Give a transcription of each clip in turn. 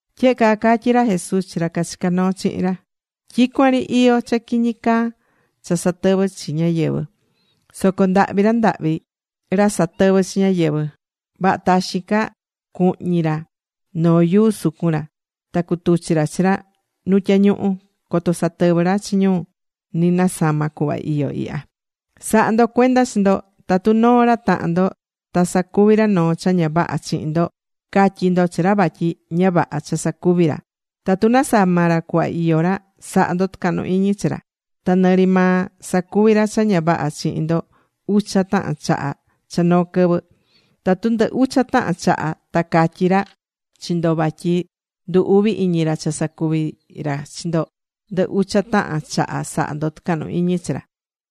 Tyehe caa catyí ra Jesús chi ra cachicá noo chihin ra: ―Tyicuan ri iyó cha quiñi caa cha satɨvɨ́ chi ñáyɨvɨ. Soco ndahvi ra ndahvi ra satɨvɨ́ chi ñáyɨvɨ. Vaha taxin ca cuhñi ra noo yuu sucun ra. Ta cutuchi ra chi ra nu tyañuhu. Coto satɨvɨ ra chi ñu ni nasama cuhva iyó ihya. ’Sa̱ha ndo cuenda chi ndo. Tatu noo ra tahan ndo ta sacuvi ra noo cha ña vaha chihin ndo. Ca̱tyi ndo chi ra vatyi ña vaha cha sacuvi ra. Tatu nasama ra cuhva iyó ra, sa̱ha ndo tucahnu iñi chi ra. Ta nɨ ri maa sacuvi ra cha ña vaha chihin ndo ucha tahan chaha cha noo quɨvɨ. Tatu ndɨ ucha tahan chaha ta catyi ra chi ndo vatyi ndu uvi iñi ra cha sacuví ra chi ndo, ndɨ ucha tahan chaha sa̱ha ndo tucahnu iñi chi ra.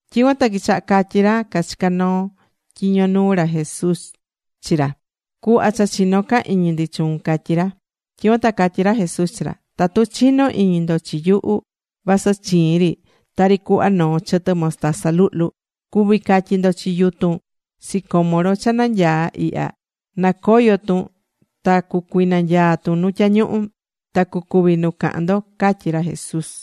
Tyicuan ta quichaha catyí ra cachicá tyiño nuu ra Jesús chi ra: ―Cu̱hva cha chinó ca iñi ndi chuun ―catyí ra. Tyicuan ta catyí ra Jesús chi ra: ―Tatu chinó iñi ndo chi yuhu vasɨ chiin ri tari cuhva noo chɨtɨ mostaza luhlu, cuví catyí ndo chi yutun sicómoro cha nanyaá ihya nacoyo tun, ta cucuinanyaa tun nu tyañuhu. Ta cucuvi nu cahan ndo ―catyí ra Jesús.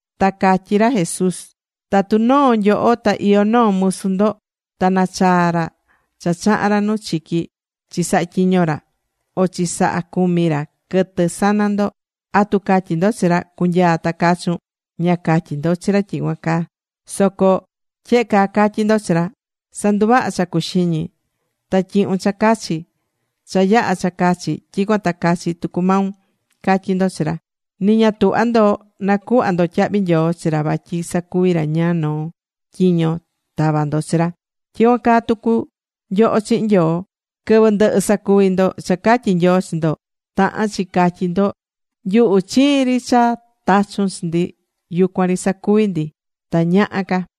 Ta catyí ra Jesús: ―Tatu noo nyoho ta iyó noo musu ndo. Ta nachaa ra cha chaha̱n ra nu chiqui chi sahatyiño ra, o chi saha cumi ra quɨtɨ sana ndo, ¿atu catyí ndo chi ra: “Cu̱nyaa ta cachun”? Ña catyí ndo chi ra tyicuan caa. Soco tyehe caa catyí ndo chi ra: “Sa̱nduvaha cha cuxiñi. Ta tyi̱hun cha cachi. Cha yaha cha cachi tyicuan ta cachi tucu maun”, catyí ndo chi ra. Ni ña tuhvá ndo nacuhva ndo tyahvi nyoo chi ra vatyi sacuvi̱ ra ñáá noo tyiño tava̱ ndo chi ra. Tyicuan caa tucu nyoho chihin Nyoo. Quɨvɨ ndɨhɨ sacuvi ndo cha catyí Nyoo chi ndo, tahán chi catyí ndo: “Nyuhu chiin ri cha tachu̱n chi ndi, yucuan ri sacuvi̱ ndi. Ta ña yaha ca.”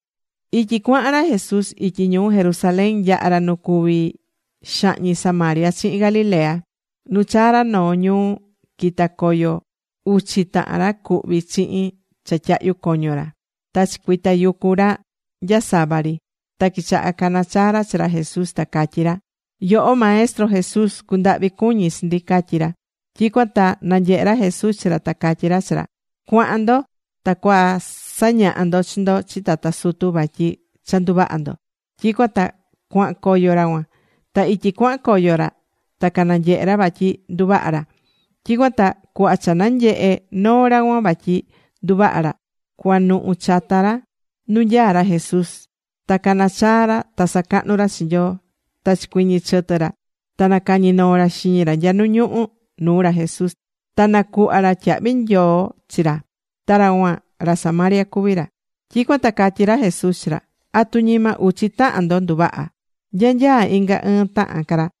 Ityi cuahan ra Jesús ityi ñuu Jerusalén yaha̱ ra nu cuví xahñi Samaria chihin Galilea. Nu chaa̱ ra noo ñuu, quita̱ coyo uchi tahan ra cuhví chihin cha tyahyu coño ra. Ta chicuitayucu ra nyasava ri. Ta quichaha cacanachaa ra chi ra Jesús, ta catyí ra: ―Yoho, Maestro Jesús, cu̱ndahvi cuñi chi ndi ―catyí ra. Tyicuan ta nanyehe̱ ra Jesús chi ra ta catyí ra chi ra: ―Cua̱han ndo. Ta cua sa̱ñaha ndo chi ndo chi tata sutu vatyi cha nduvaha̱ ndo. Tyicuan ta cuahan coyo ra cuan. Ta ityi cuahan coyo ra ta cananyehe̱ ra vatyi nduvaha̱ ra. Tyicuan ta cuhva cha nanyehe noo ra cuan vatyi nduvaha̱ ra, cuanuhu chata ra nu nyaá ra Jesús. Ta cana̱ chaa ra, ta sacahnu ra chi Nyoo. Ta chicuɨñɨ̱ chɨtɨ ra. Ta nacañi̱ noo ra xiñi ra nya nu ñuhu nuu ra Jesús. Ta nacuhva̱ ra tyahvi nyoo chi ra. Ta ra cuan, ra Samaria cuví ra. Tyicuan ta catyí ra Jesús chi ra: ―¿Atu ñima uchi tahan ndo nduvaha̱? ¿Nya nyaá inga ɨɨn tahan ca ra?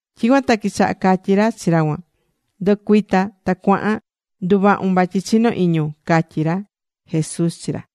Tyicuan ta quichaha catyí ra chi ra cuan: ―Ndu̱cuita ta cua̱han. Nduvahu̱n vatyi chinó iñun ―catyí ra Jesús chi ra.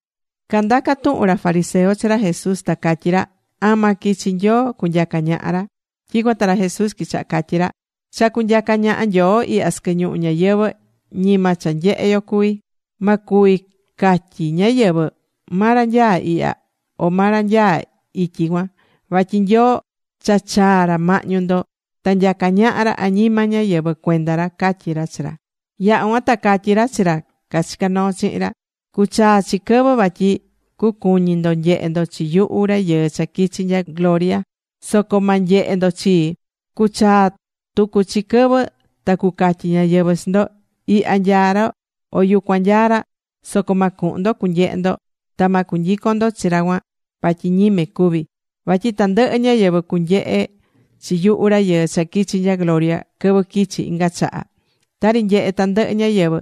Candaca̱ tuhun ra fariseo chi ra Jesús, ta catyí ra: ―¿Ama quichi Nyoo cunyaca ñaha ra? Tyicuan ta ra Jesús quichaha catyí ra: ―Cha cunyaca ñaha Nyoo ihya sɨquɨ ñuhu ñayɨvɨ̱, ñima cha nyehé yo cuví. Ma cuvi catyi ñáyɨvɨ: “Ma ra nyaá ihya, o ma ra nyaá ityi cuan.” Vatyi Nyoo cha chaa̱ ra mahñu ndo, ta nyacá ñaha ra añima ñáyɨvɨ cuenda ra ―catyí ra chi ra. Yaha̱ cuan ta catyí ra chi ra cachicá noo chihin ra: ―Cuchaa chi quɨvɨ vatyi cucuñi ndo nyehe ndo chi yuhu Rayɨɨ cha quichi̱ nya gloria. Soco ma nyehe ndo chii. Cuchaa tucu chi quɨvɨ ta cucatyi ñáyɨvɨ chi ndo: “Ihya nyaá ra”, o “Yucuan nyaá ra.” Soco ma cuhun ndo cunyehe ndo. Ta ma cunyicon ndo chi ra cuan vatyi ñime cuví. Vatyi tandɨhɨ ñáyɨvɨ cunyehe chi yuhu Rayɨɨ cha quichi̱ nya gloria quɨvɨ quichi inga chaha. Tari nyehé tandɨhɨ ñáyɨvɨ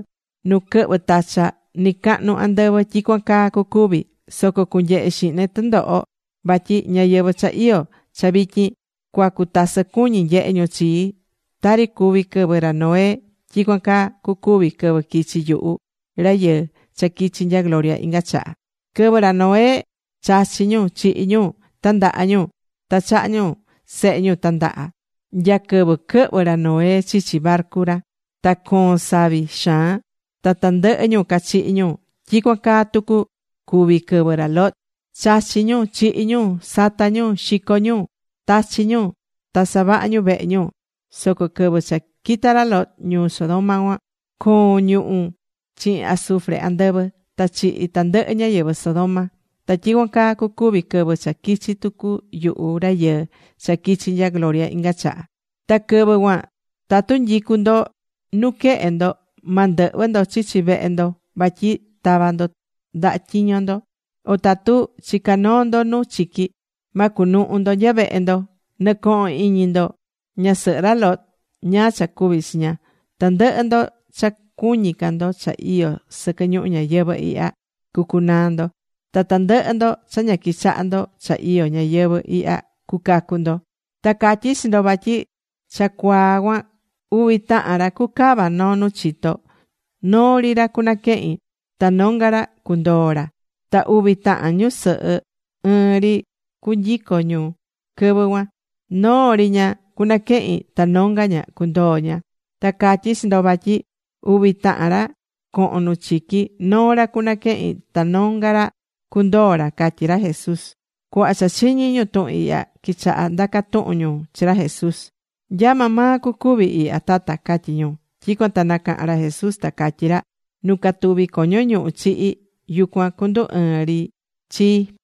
nu quɨhvɨ tacha nɨcahnu andɨvɨ, tyicuan caa cucuvi. Soco cunyehe xihne tundoho. Vatyi ñáyɨvɨ cha iyó cha vityin cua cutasɨ cuñi nyehe ñu chii. Tari cuví quɨvɨ ra Noé, tyicuan caa cucuvi quɨvɨ quichi yuhu Rayɨɨ cha quichi nya gloria inga chaha. Quɨvɨ ra Noé, chachí ñu. Chihí ñu. Tandahá ñu. Ta chahá ñu sehe ñu tandaha. Nya quɨvɨ quɨhvɨ̱ ra Noé chichi barcu ra, ta coon savi xaan. Ta tandɨhɨ ñu cachihi̱ ñu. Tyicuan caa tucu cuvi̱ quɨvɨ ra Lot. Chachí ñu. Chihí ñu. Satá ñu. Xicó ñu. Tachí ñu. Ta savahá ñu vehe ñu. Soco quɨvɨ cha quita̱ ra Lot ñuu Sodoma cuan, coo̱n ñuhu̱ chihin azufre andɨvɨ. Ta chihi̱ tandɨhɨ ñáyɨvɨ Sodoma. Ta tyicuan caa cucuvi quɨvɨ cha quichi tucu yuhu Rayɨɨ cha quichi nya gloria inga chaha. ’Ta quɨvɨ cuan tatu nyicú ndo nuquehe ndo, ma ndɨhvɨ ndo chichi vehe ndo vatyi tava ndo ndaha tyiño ndo. O tatu chicá noo ndo nu chiqui, ma cunuhu ndo nya vehe ndo. Nɨ̱cohon iñi ndo ñasɨhɨ ra Lot, ñáá cha cuvi̱ chi ña. Tandɨhɨ ndo cha cuñí ca ndo cha iyó sɨquɨ ñuhu ñayɨvɨ̱ ihya, cucunaa ndo. Ta tandɨhɨ ndo cha ña quichaha ndo cha iyó ñáyɨvɨ̱ ihya, cucacu ndo. ’Ta catyí chi ndo vatyi cha cuaa cuan uvi tahan ra cucava noo nu chito. Noo ri ra cunaquehin. Ta nonga ra cundoo ra. Ta uvi tahan ñusɨhɨ ɨɨn ri cu nyicó ñu quɨvɨ cuan. Noo ri ña, cunaquehin. Ta nonga ña cundoo ña. Ta catyí chi ndo vatyi uvi tahan ra cohon nu chiqui. Noo ra cunaquehin, ta nonga ra cundoo ra ―catyí ra Jesús. Cuhva cha chiñi̱ ñu tuhun ihya, quichaha ndaca tuhun ñu chi ra Jesús. ―¿Nya maa maa cucuvi ihya Tata? ―catyí ñu. Tyicuan ta nacaha̱n ra Jesús ta catyí ra: ―Nu catuví coño ñuhu chihi, yucuan cundu ɨɨn ri chii.